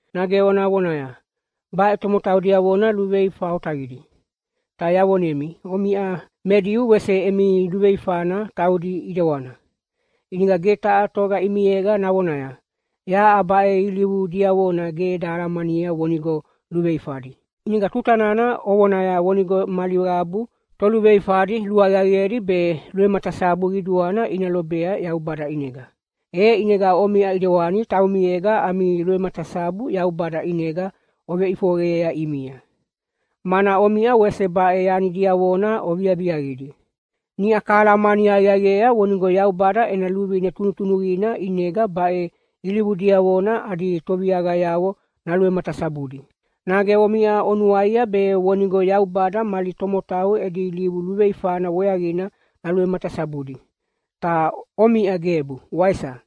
Nage ona vonaya, “Baʼe tomotau diavona luveifa otaqidi!” Ta yavonemi omiʼa me Diu wese emi luveifana taudi ʼidewana, ʼinega ge taha toga ʼimiega navonaya, “Yaʼa baʼe ilivu diavona ge eda alamania vonigo luveifadi.” ʼInega tuta nana ovonaya vonigo mali qabu toluveifadi luaqiaqiedi be luvematasabu qiduana ina lobea Yaubada ʼinega, e ʼinega omiʼa ʼidewani taumiega ami luvematasabu Yaubada ʼinega oveveʼifoqeyea ʼimia, mana omiʼa wese baʼe yani diavona oviaviaqidi. Niʼa kahalamani aqiaqiea vonigo Yaubada ena luvine tunutunuqina ʼinega baʼe ilivu diavona adi toviaqayavo naluvematasabudi. Nage omiʼa onuaia be vonigo Yaubada mali tomotau edi ilivu luveifana weaqina naluvematasabudi, ta omiʼa gebu, waisa?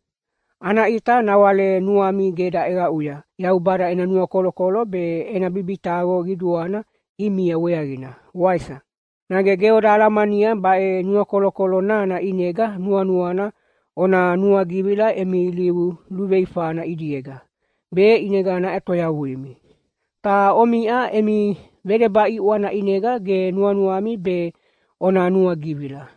Ana ʼita nawale nuami ge daʼeqaʼuya Yaubada ena nuakolokolo be ena bibitaqo qiduana ʼimia weaqina, waisa? Nage ge oda alamania baʼe nuakolokolo nana ʼinega nuanuana ona nuagivila emi ilivu luveifana ʼidiega, be ʼinega naʼetoyavuimi. Ta omiʼa emi vedeba ʼiʼwana ʼinega ge nuanuami be ona nuagivila.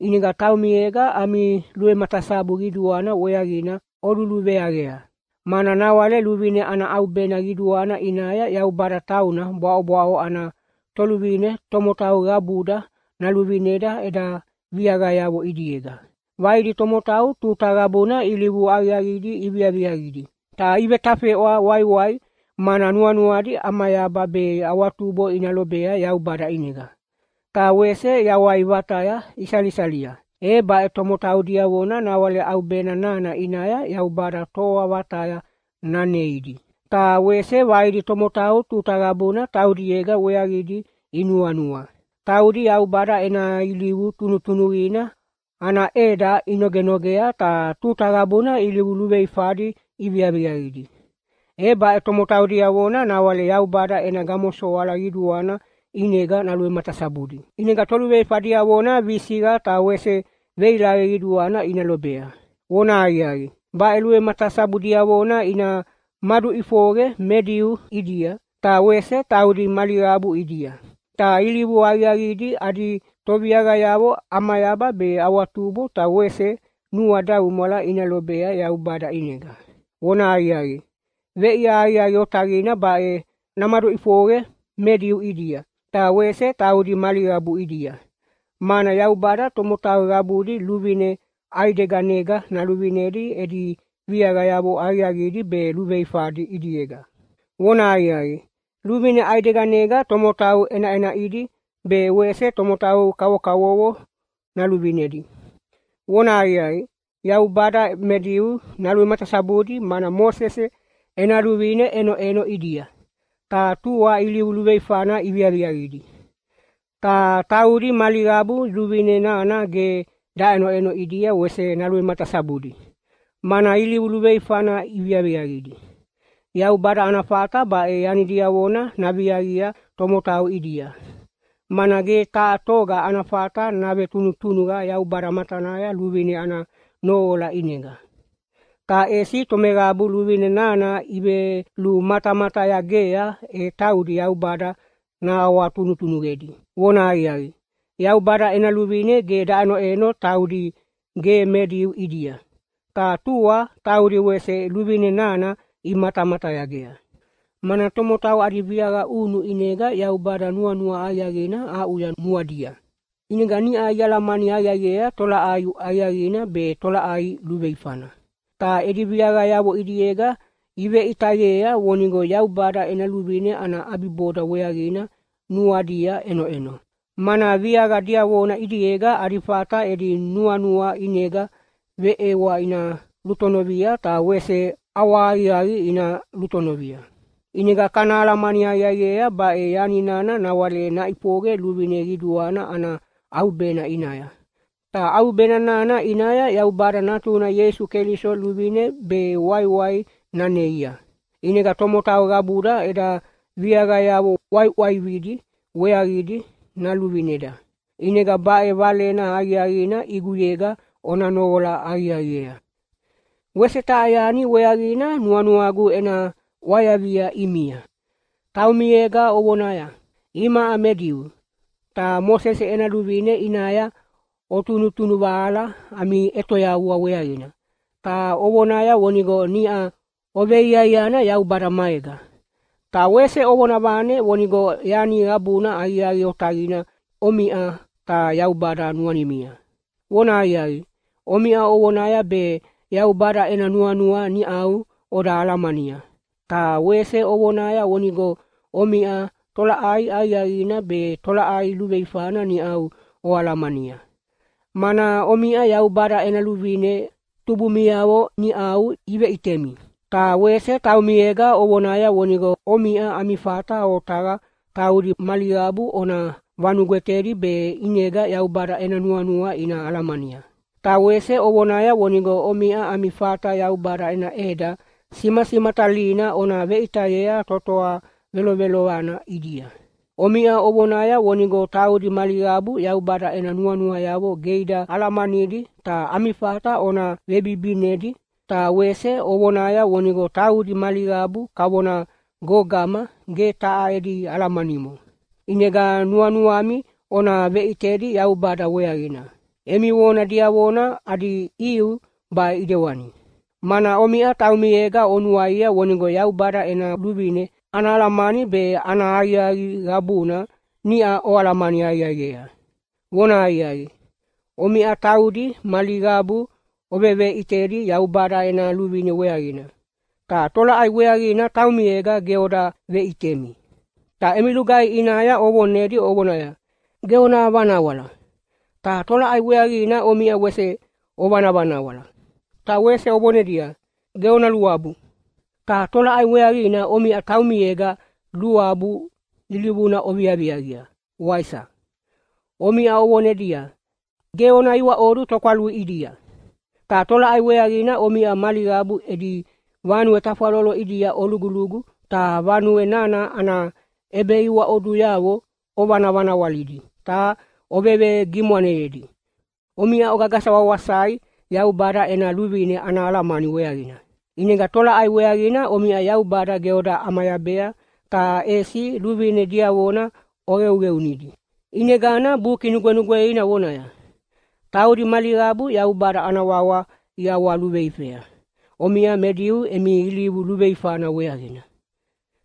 ʼInega taumiega ami luvematasabu qiduana weaqina oluluveaqea. Mana nawale luvine ana ʼaubena qiduana ʼinaya Yaubada tauna bwaʼobwaʼo ana Toluvine “tomotau qabuda naluvineda eda viaqayavo ʼidiega”. Vaidi tomotau tuta qabuna ilivu aqiaqidi iviaviaqidi, ta ivetafeʼwa waiwai, mana nuanuadi ʼamayaba be awatubo ina lobea Yaubada ʼinega. Ta wese yawai vataya isalisalia. E baʼe tomotau diavona nawale ʼaubena nana ʼinaya Yaubada toa vataya naneidi. Ta wese vaidi tomotau tuta qabuna taudiega weaqidi inuanua. Taudi Yaubada ena ilivu tunutunuqina ana ʼeda inogenogea ta tuta qabuna ilivu luveifadi iviaviaqidi. E baʼe tomotau diavona nawale Yaubada ena gamosoala qiduana ʼinega naluvematasabudi. ʼInega toluveifa diavona visiqa ta wese veilaqe qiduana ina lobea. Vonahaqiaqi, baʼe luvematasabu diavona ina maduʼifoqe me Diu ʼidia, ta wese taudi mali qabu ʼidia. Ta ilivu aqiaqidi adi toviaqayavo ʼamayaba be awatubo ta wese nuadaumwala ina lobea Yaubada ʼinega. Vonahaqiaqi, veʼia aqiaqi otaqina baʼe namaduʼifoqe me Diu ʼidia, ta wese taudi mali qabu ʼidia, mana Yaubada tomotau qabudi luvine ʼaideganega naluvinedi edi viaqayavo aqiaqidi be luveifadi ʼidiega. Vonahaqiaqi, luvine ʼaideganega tomotau ʼenaʼenaʼidi be wese tomotau kavokavovo naluvinedi. Vonahaqiaqi, Yaubada me Diu naluvematasabudi mana Mosese ena luvine ʼenoʼeno ʼidia, ta tua ilivu luveifana iviaviaqidi. Ta taudi mali qabu luvine nana ge daʼenoʼeno ʼidia wese naluvematasabudi, mana ilivu luveifana iviaviaqidi. Yaubada ana fata baʼe yani diavona naviaqia tomotau ʼidia, mana ge taha toga ana fata navetunutunuqa Yaubada matanaya luvine ana noqola ʼinega. Ta ʼesi tomeqabu luvine nana ivelumatamatayagea, e taudi Yaubada nahawatunutunuqedi. Vonahaqiaqi, Yaubada ena luvine ge daʼenoʼeno taudi ge me Diu ʼidia, ta tua taudi wese luvine nana imatamatayagea, mana tomotau adi viaqa ʼunu ʼinega Yaubada nuanua aqiaqina aʼuya nuadia, ʼinega niʼa ialamani aqiaqiea tolaʼai aqiaqina be tolaʼai luveifana. Ta edi viaqayavo ʼidiega iveʼitayea vonigo Yaubada ena luvine ana ʼabiboda weaqina nuadia ʼenoʼeno, mana viaqa diavona ʼidiega adi fata edi nuanua ʼinega veʼewa ina lutonovia ta wese ʼawahaqiaqi ina lutonovia. ʼInega kana alamani aqiaqiea, baʼe yani nana nawale naʼifoqe luvine qiduana ana ʼaubena ʼinaya, ta ʼaubena nana ʼinaya Yaubada Natuna Ieisu Keliso luvine be waiwai naneia, ʼinega tomotau qabuda eda viaqayavo ʼwaiʼwaividi weaqidi naluvineda. ʼInega baʼe valena aqiaqina ʼiguyega ona noqola aqiaqiea. Wese taha yani weaqina nuanuagu ena ʼwayavia ʼimia. Taumiega ovonaya, “Imaʼa me Diu.” Ta Mosese ena Luvine ʼinaya otunutunuvahala ami ʼetoyavua weaqina, ta ovonaya vonigo niʼa oveiaiana Yaubada maega. Ta wese ovona vane vonigo yani qabuna aqiaqi otaqina omiʼa ta Yaubada nuanimia. Vonahaqiaqi, omiʼa ovonaya be Yaubada ena nuanua niʼau oda alamania, ta wese ovonaya vonigo omiʼa tolaʼai aqiaqina be tolaʼai luveifana niʼau oalamania, mana omiʼa Yaubada ena luvine tubumiavo niʼau iveʼitemi. Ta wese taumiega ovonaya vonigo omiʼa ami fata otaqa taudi mali qabu ona vanugwetedi be ʼinega Yaubada ena nuanua ina alamania. Ta wese ovonaya vonigo omiʼa ami fata Yaubada ena ʼeda simasimatalina ona veʼitayea totoa velovelovana ʼidia. Omiʼa ovonaya vonigo taudi mali qabu Yaubada ena nuanuayavo ge ida alamanidi ta ami fata ona vebibinidi, ta wese ovonaya vonigo taudi mali qabu kavona gogama ge taha edi alamanimo, ʼinega nuanuami ona veʼitedi Yaubada weaqina. Emi vona diavona adi ʼiu baʼe ʼidewani, mana omiʼa taumiega onuaia vonigo Yaubada ena luvine ana alamani be ana aqiaqi qabuna niʼa oalamani aqiaqiea. Vonahaqiaqi, omiʼa taudi mali qabu oveveʼitedi Yaubada ena luvine weaqina, ta tolaʼai weaqina taumiega ge oda veʼitemi? Ta emi lugaihi ʼinaya ovonedi ovonaya, “Ge ona vanawala!” Ta tolaʼai weaqina omiʼa wese ovanavanawala? Ta wese ovonedia, “Ge ona luabu!” Ta tolaʼai weaqina omiʼa taumiega luabu ilivuna oviaviaqia, waisa? Omiʼa ovonedia, “Ge ona iwaʼodu tokwalui ʼidia!” Ta tolaʼai weaqina omiʼa mali qabu edi vanue tafwalolo ʼidia olugulugu ta vanue nana ana ʼebeiwaʼoduyavo ovanavanawalidi ta ovevegimwaneyedi? Omiʼa ogagasa wawasai Yaubada ena luvine ana alamani weaqina. ʼInega tolaʼai weaqina omiʼa Yaubada ge oda ʼamayabea, ta ʼesi luvine diavona oqeuqeunidi? ʼInegana Buki Nugwenugweina vonaya, “Taudi mali qabu Yaubada ana wawa iʼawaluveifea omiʼa me Diu emi ilivu luveifana weaqina.”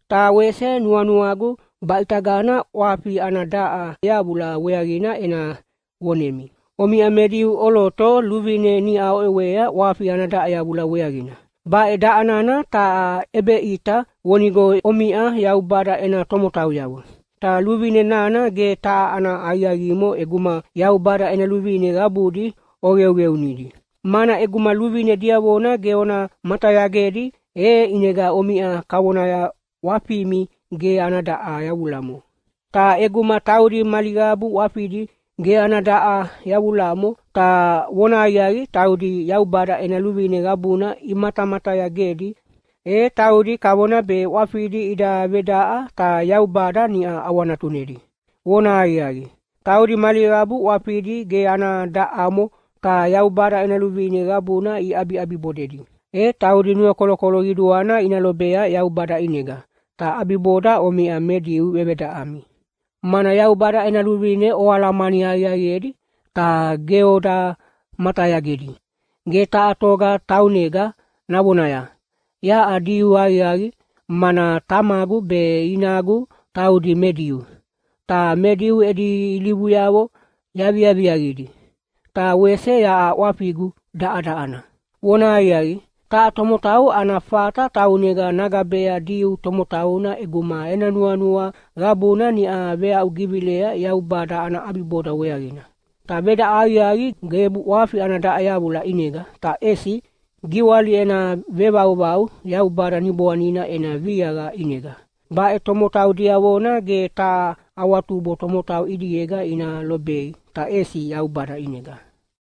Ta wese nuanuagu baʼitagana ʼwafi ana daʼa yavula weaqina ena vonemi. Omiʼa me Diu ʼoloto luvine niʼa oʼewea ʼwafi ana daʼa yavula weaqina. Baʼe daʼa nana taha ʼebeʼita vonigo omiʼa Yaubada ena tomotauyavo. Ta luvine nana ge taha ana aqiaqimo ʼeguma Yaubada ena luvine qabudi oqeuqeunidi. Mana ʼeguma luvine diavona ge ona matayagedi, e ʼinega omiʼa kavonaya ʼwafimi ge ana daʼa yavulamo. Ta ʼeguma taudi mali qabu ʼwafidi ge ana daʼa yavulamo, ta vonahaqiaqi taudi Yaubada ena luvine qabuna imatamatayagedi, e taudi kavona be ʼwafidi ida vedaʼa ta Yaubada niʼa ʼawanatunedi. Vonahaqiaqi, taudi mali qabu ʼwafidi ge ana daʼamo ta Yaubada ena luvine qabuna iʼabiʼabibodedi, e taudi nuakolokolo qiduana ina lobea Yaubada ʼinega, ta ʼabiboda omiʼa me Diu vevedaʼami, mana Yaubada ena luvine oalamani aqiaqiedi ta ge oda matayagedi. Ge taha toga taunega navonaya, “Yaʼa Diu aqiaqi, mana tamagu be inagu taudi me Diu, ta me Diu edi ilivuyavo yaviaviaqidi, ta wese yaʼa ʼwafigu daʼadaʼana.” Vonahaqiaqi, taha tomotau ana fata taunega nagabea Diu tomotauna ʼeguma ena nuanua qabuna niʼa veaʼugivilea Yaubada ana ʼabiboda weaqina. Ta vedaʼa aqiaqi gebu ʼwafi ana daʼa yavula ʼinega, ta ʼesi giwali ena vevauvau Yaubada Niboanina ena viaqa ʼinega. Baʼe tomotau diavona ge taha awatubo tomotau ʼidiega ina lobei, ta ʼesi Yaubada ʼinega.